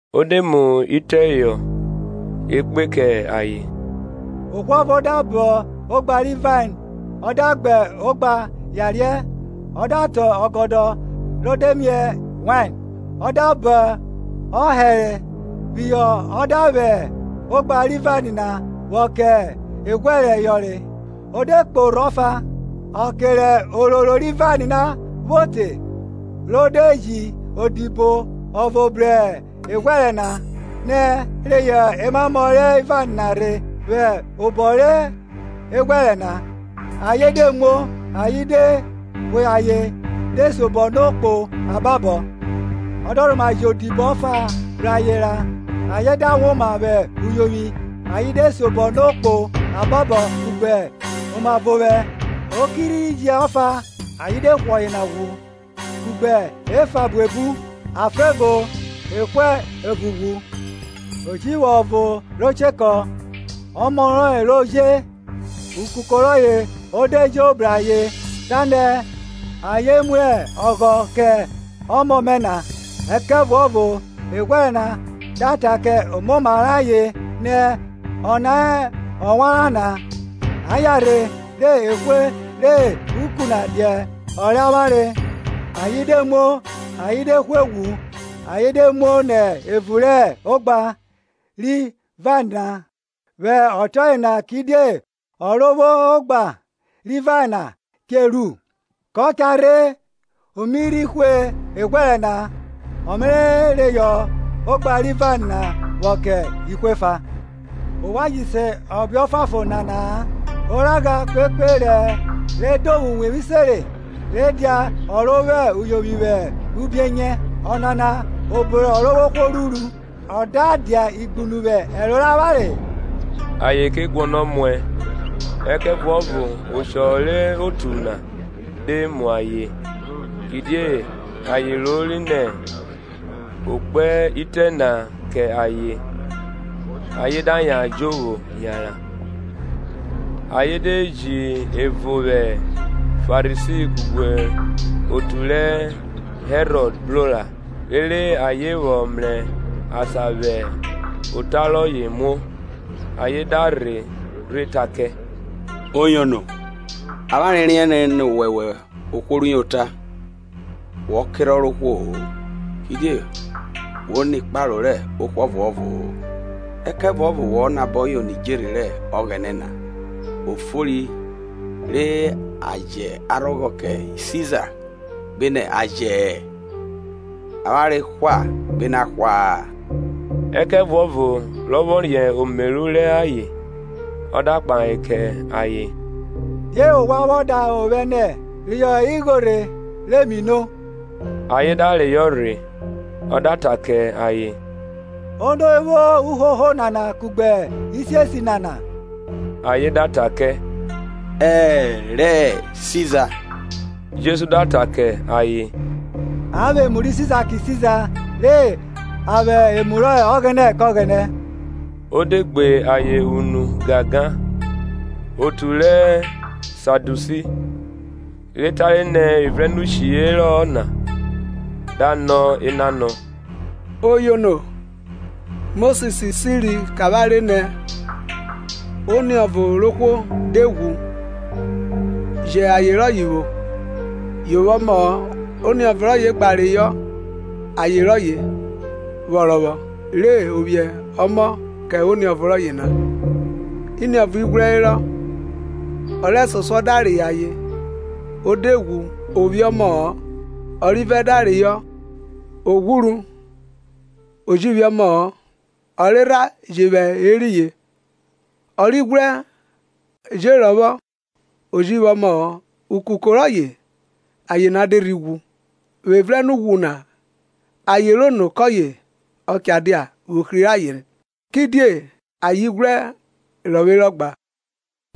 Ọ de mu itẹ họ ekpe kẹ ayen. Ohwo ọvo da kọn ogba ri vain, o da gba ogba yariẹ, ọ da tọn ọgọdọ re de miẹ wain, ọ da bọn ohẹrhẹ phihọ ọ da vwẹ ogba ri vain na vwọ kẹ eghwẹrẹ yọnre, o de kpo orho ọfa. Ọke rẹ ororo ri vain vwo te re o de ji odibo ọvo bru eghwẹrẹ na, na reyọ emamọ ri vain na rhe vwẹ obọ re eghwẹrẹ na. Ayen de muo, ayen de hwe ayen de siobọ no kpo ababọ. Ọ da rhoma ji odibo ọfa bru ayen ra, ayen da woma vwẹ uyovwi ayen de siobọ no kpo ababọ kugbe omavovwẹ. O ki rhe ji ọfa; ayen de hwe ọyena ghwu kugbe efa buebu; a fa evo, e hwe evo ghwu. Ọ ji vwo ọvo ro chekọ, ọmọ rọye ro je; ukuko rọye o de jo bru ayen, ta nẹ, Ayen mu ọghọ kẹ ọmọ mẹ na. Ẹkẹvuọvo eghwẹrẹ na da ta kẹ omoma rẹ ayen, nẹ, Ọna hẹ owanrau na; a yanrhe, re e hwe re uku na dia ọ rẹ avwanre. Ayen de muo, ayen de hwe ghwu ayen de muo nẹ evun rẹ ogba, ri vain na. Vwẹ ọtiọye na kidie ọ ro vwo ogba ri vain na che ru? kọ cha rhe o mi rhi hwe eghwẹrẹ na, ọ Me reyọ ogba ri vain na vwo kẹ ihwo efa. Ovwan ji se ọbe ọfuanfon nana-a; Oragha kpekpe rẹ edovwo uwevwi sẹnre rhe dia ọ ro vwo uyovwi vwẹ ubienyẹ; Ọnana obo rẹ Ọrovwohwo ruru, ọ da dia igbunu vwẹ ẹro rẹ avwanre? Ayen ke guọnọ muẹ ẹkẹvuọvo oshọ re otu na de mu ayen, kidie ayen rori nẹ o kpe itẹ na kẹ ayen; ayen da yan jovwo yanran. Ayen de ji ẹvo vwẹ Farisi kugbe otu rẹ Herọd bro ra, rere ayen vwọ mrẹ asan vwẹ ota rọye muo. Ayen da rhe rhe ta kẹ, Oyono, avwanre riẹnre nẹ wọwẹ ohwo rẹ uyota, wọ kerhọn rẹ ohwo-o; kidie wo nẹ ikparo rẹ ohwo ọvuọvo-o, ẹkẹvuọvo wo nabọ yono idjerhe rẹ Ọghẹnẹ na; O fori re a jẹ arhọghọ kẹ Siza, gbenẹ a jẹ-ẹ? Avwanre hwa gbenẹ a hwa-a? Ẹkẹvuọvo rọ vwọ riẹn omeru rẹ ayen, ọ da kpahe kẹ ayen, Die ovwan vwọ davwe ovwẹ nẹ, Reyọ igho rhe, re mi no. Ayen da reyọ rhe. Ọ da ta kẹ ayen, Ono vwo uhoho nana kugbe isiesi nana? Ayen da ta kẹ, E rẹ Siza. Jesu da ta kẹ ayen, A vwẹ emu rẹ Siza kẹ Siza, re a vwẹ emu rẹ Ọghẹnẹ. Ọ de gbe ayen unu gangan. Otu rẹ Sadusi, re tare nẹ evrẹnnshi herọ-ọ na; da nọ enanọ. Oyono, Mosis siri kẹ avwanre nẹ, Oniọvo rẹ ohwo de ghwu jẹ aye rọye vwo, yo vwo ọmọ-ọ, oniọvo rọye gba reyọ aye rọye vwọ rọvwọ, re o vwiẹ ọmọ kẹ oniọvo rọye na. Iniọvo ighwrẹ herọ, ọ rẹsosuọ da reyọ aye, o de ghwu o vwiẹ ọmọ-ọ; Ọrivẹ da reyọ, o ghwuru, o ji vwiẹ ọmọ-ọ; Ọrerha je vwẹ eriyin. Ọrighwrẹ je rọvwọ o ji vwo ọmọọ. Ukuko rọye aye na de rhi ghwu. Vwẹ evrẹnughwu na aye rẹ ono kọye ọ cha dia vwẹ ohri rẹ ayen? Kidie ayen ighwrẹ rọvwerọ gba.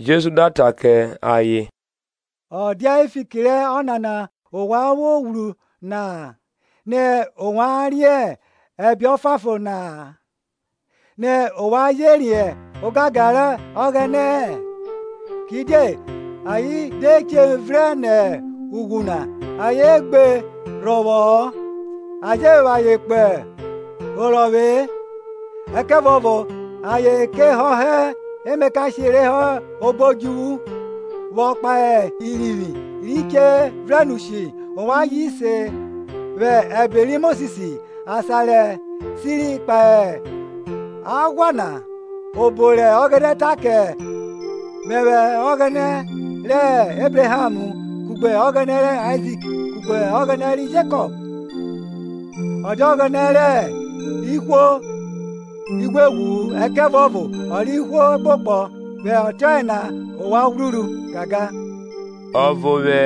Jesu da ta kẹ ayen, ọ dia fiki rẹ ọnana ovwan vwo ghwru na-a nẹ ovwan riẹn ẹbe ọfuanfon na-a, nẹ ovwan je riẹn ogangan rẹ Ọghẹnẹ-ẹ? Kidie ayen de che vrẹn nẹ ughwu na, ayen gbe rọvwọ-ọ a je vwẹ ayen kpo orọvwe-e; ẹkẹvuọvo ayen ke họhọ emakashe re hẹ obo odjuvwu. Vwọ kpahe irivwi ri che vrenushi ovwan ji se vwẹ ẹbe ri Mosis, asan re shi kpahe Aghwa na, obo rẹ Ọghẹnẹ ta kẹ Mẹvwẹ ọghẹnẹ rẹ Ebraham, kugbe Ọghẹnẹ rẹ Aizik kugbe Ọghẹnẹ ri Jekọp? Ọ dia Ọghẹnẹ rẹ ihwo ighweghwu-u ẹkẹvuọvo o rẹ ihwo ekpokpọ: vwẹ ọtiọye na ovwan ghwruru gangan. Ọvo vwẹ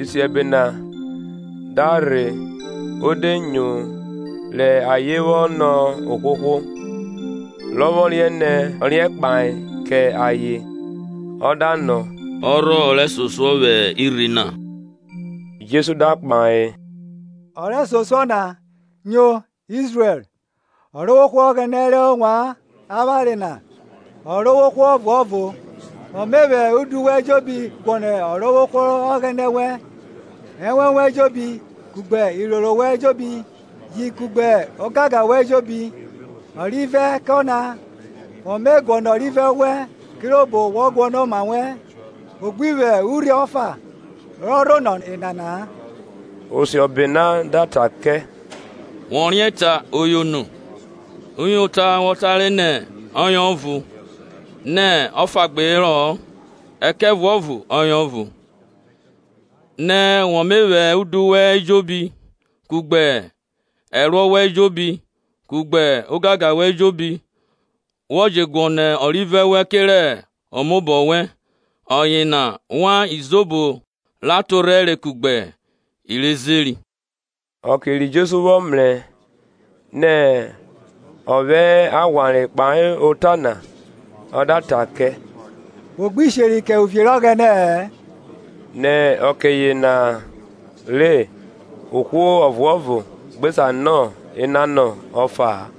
isiẹbe na da rhe o de nyo rẹ ayen vwọ nọ ohwohwo, rọ vwọ riẹn nẹ ọ riẹn kpahe kẹ ayen, ọ da nọ, ọ rhọ ọ rẹsosuọ vwẹ irhi na? Jesu da kpahe, Ọ rẹsosuọ na, Nyo, Izrẹl; Ọrovwohwo Ọghẹnẹ rẹ avwanre na, Ọrovwohwo ọvuọvo; Wọ me vwẹ udu wẹn ejobi guọnọ Ọrovwohwo Ọghẹnẹ vwẹ ẹnwẹn wẹn ejobi, kugbe iroro wẹn ejobi ji kugbe ogangan wẹn ejobi. Ọrivẹ kẹ ọna, wọ mẹ guọnọ ọrivẹ wẹn kirobo wọ guọnọ oma wẹn. O gbi vwo Urhi ọfa rọ rhonọ enana-a. Osiọbe na da ta kẹ, wọ riẹn ta, Oyono, uyota wọ tare nẹ ọye ọvo; nẹ ọfa gbe herọ-ọ ẹkẹvuọvo ọye ọvo; nẹ wọ me vwẹ udu wẹn ejobi, kugbe ẹruọ wẹn ejobi, kugbe ogangan wẹn ejobi, wọ je guọnọ ọrivẹ wẹn kerẹ omaobọ wẹn, ọyena wan izobo ra torhẹre kugbe i re Zeri. Ọke ri Jesu vwọ mrẹ nẹ ọ vwẹ aghwanre kpahe ota na, Ọ da ta kẹ, Wo gbi sheri kẹ uvie rẹ Ọghẹnẹ-ẹ. Nẹ ọke yena ra ohwo ọvuọvo gbe sa nọ enanọ ọfa-a.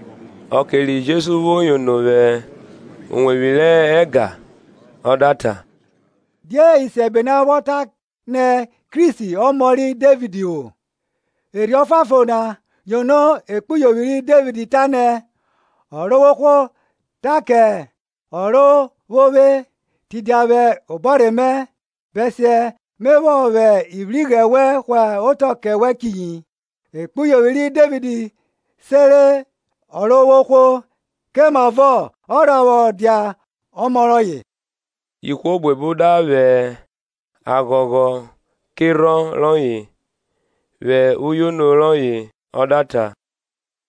Ọke ri Jesu vwo yono vwẹ uwevwi rẹ ẹga ọ da ta, Die isiẹbe na vwọ ta nẹ Kristi ọmọ ri Devid vwọ? Erhi Ọfuanfon na yono ekpuyovwi ri Devid ta nẹ, Ọrovwohwo ta kẹ Ọrovwovwe, Tidia vwẹ obọrhe mẹ, Bẹsiẹ Me vwọ vwẹ ivwighrẹ wẹn hwa otọ kẹ wẹ chiyi. Ekpuyovwi ri Devid sere Ọrovwohwo; kemavọ ọ rha vwọ dia ọmọ rọye? Ihwo buebu da vwẹ aghọghọ kerhọn rọye. Vwẹ uyono rọye ọ da ta,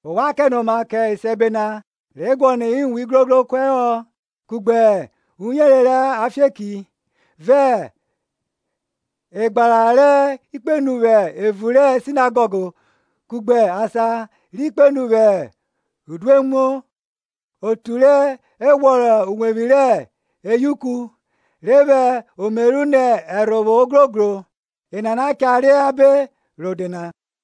Ovwan kẹnoma kẹ isiẹbe na, re guọnọ iwun igrogro kuẹhọ, kugbe uyere rẹ afieki. vẹ egbara ri kpenu vwẹ evun rẹ sinagọg, kugbe asan ri kpenu vwẹ udoemu; otu re ghwọrọ uwevwi rẹ eyauku, re vwẹ omeru nẹ ẹrhovwo ogrogro, enana cha re abe rode na.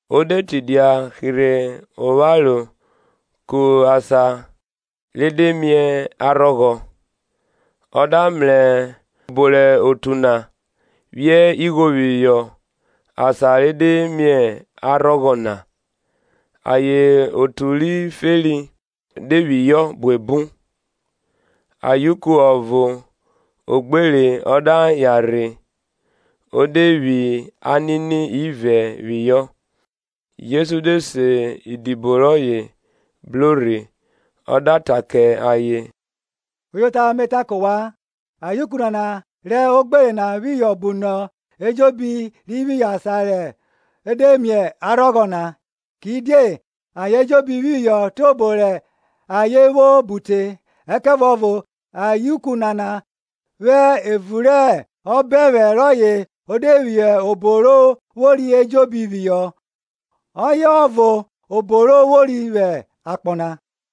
O de tidia hirhe opharo ku asan re de mie arhọghọ, ọ da mrẹ obo rẹ otu na phiẹ igho phihọ asan re de mie arhọghọ na; ayen otu ri feri de phihọ buebu. Ayuku ọvo ogbere o da yan rhe, o de phi anini ivẹ phihọ. Jesu de se idibo rọye bro rhe ọ da ta kẹ ayen, uyota me ta kẹ ovwan, Ayeuku nana rẹ ogbere na phihọ bunọ ayen ejobi ri phihọ asan re de mie arhọghọ na; kidie ayen ejobi phihọ tiobo rẹ ayen vwo bu te; ẹkẹvuọvo ayeuku nana vwẹ evun rẹ obẹnvwẹ rọye o de phi obo ro vwori ejobi phihọ, ọye ọvo obo ro vwori vwẹ akpọ na.